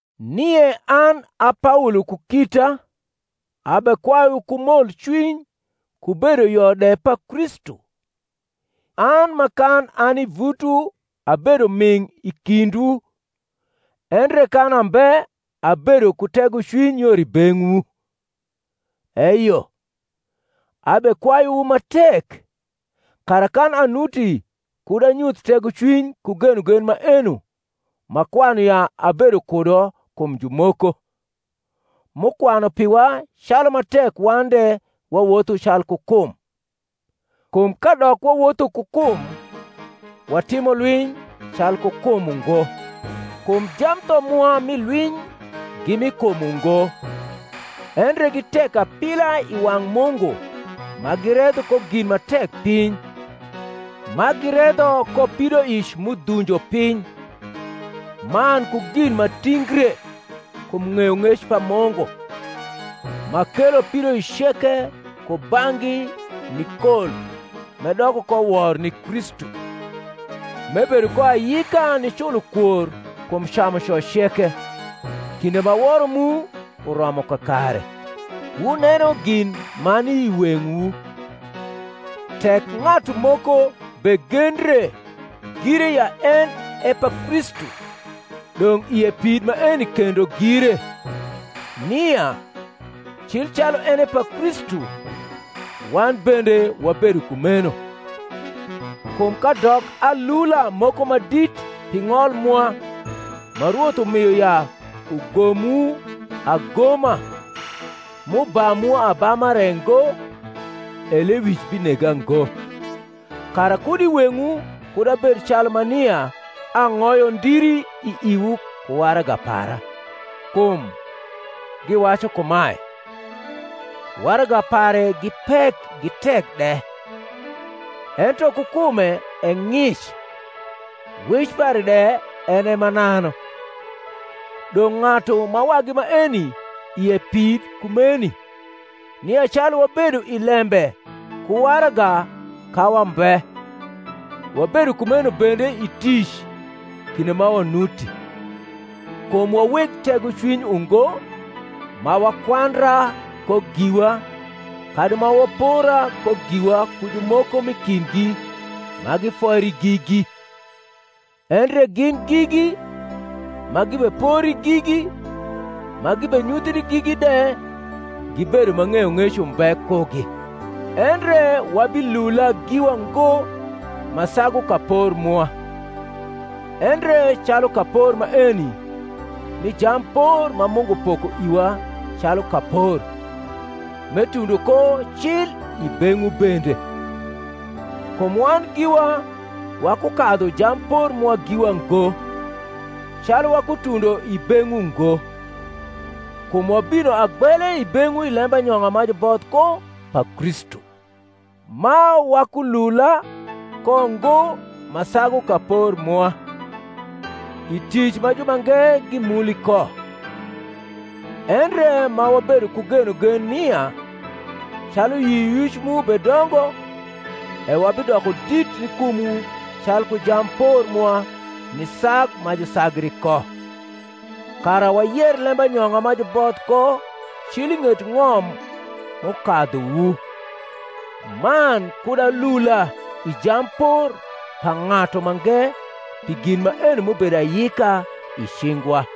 Nie an a Paolo ku kita abekwayuwu ku molcwiny ku bedoyo de pa Kristu, an ma kan ani i vutwu abedo ming’ i kindwu endre kan ambe abedo ku tegocwiny yor i beng’wu: eyo, abekwayuwu ma tek, kara kan anuti kud anyuth tegocwiny ku genogen maeno m’akwanu ya abedo kudo kum jumoko, m’ukwanu piwa calu ma tek wan de wawotho calku kum. Kum kadok wawotho ku kum, watimo lwiny calku kum ungo kum jamtho mwa mi lwiny gi mi kum ungo, endre gi tek apila i wang’ Mungu ma giredho ko gin ma tek piny; ma giredho ko pidoic m’udhunjo piny, man ku gin ma tingre kum ng’eyong’ec pa Mungu, ma kelo pidoic ceke kubang’gi ni kol m’edoko ko wor ni Kristu; m’ebedo ko ayika niculo kwor kum camuco ceke, kinde ma woro mu uromo kakare. Wuneno gin ma ni i weng’wu. Tek ng’atu moko begendre gire ya en e pa Kristu, dong’ ie pid maeni kendo gire, nia, cil calu en e pa Kristu, wan bende wabedo kumeno. Kum kadok alula moko ma dit pi ng’ol mwa (ma Rwoth umio ya ugomwu agoma, m’ubamwu abama re ngo), e lewic binega ngo. kara kud i weng’wu kud abed calu ma nia ang’oyo ndiri i iwu ku waraga para. Kum, giwacu kumae, Waraga pare gi pek gi tek de; ento ku kume e ng’ic, wec pare de en e mananu. Dong’ ng’atu ma wagi maeni ie pid kumeni, nia calu wabedo i lembe ku waraga ka wambe, wabedo kumeno bende i tic kinde ma wanuti. Kum wa weg tegocwiny ungo ma wakwandra ko giwa kadi ma wapora ko giwa ku jumoko m’i kindgi ma gifoiri gigi: endre gin gigi, ma gibepori gigi, ma gibenyuthri gigi de gibedo ma ng’eyong’ec umbe kugi. Endre wabilula giwa ngo ma sagu kapor mwa, endre calu kapor maeni mi jampor ma Mungu poko iwa calu kapor, m’etundo ko cil i beng’wu bende. Kum wan giwa wakukadhu jampor mwa giwa ngo, calu wakutundo i beng’wu ngo: kum wabino agbele i beng’wu i lembanyong’a ma juboth ko pa Kristu: ma wakulula ko ngo ma sagu kapor mwa, i tic ma jumange gimuli ko; endre ma wabedo ku genogen nia, calu yioyic mu bedongo, e wabidoko dit ni kumwu calku jampor mwa ni sag ma jusagri ko, kara wayer lembanyong’a ma juboth ko cil i ng’et ng’om m’ukadhuwu, man kud alula i jampor pa ng’atu mange pi gin maeni m’ubedo ayika i cingwa.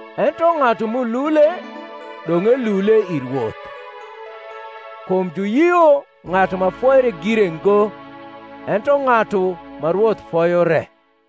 Ento ng’atu m’ulule, dong’ elule i Rwoth. Kum juyio ng’atu ma foire gire ngo, ento ng’atu ma Rwoth foyo re.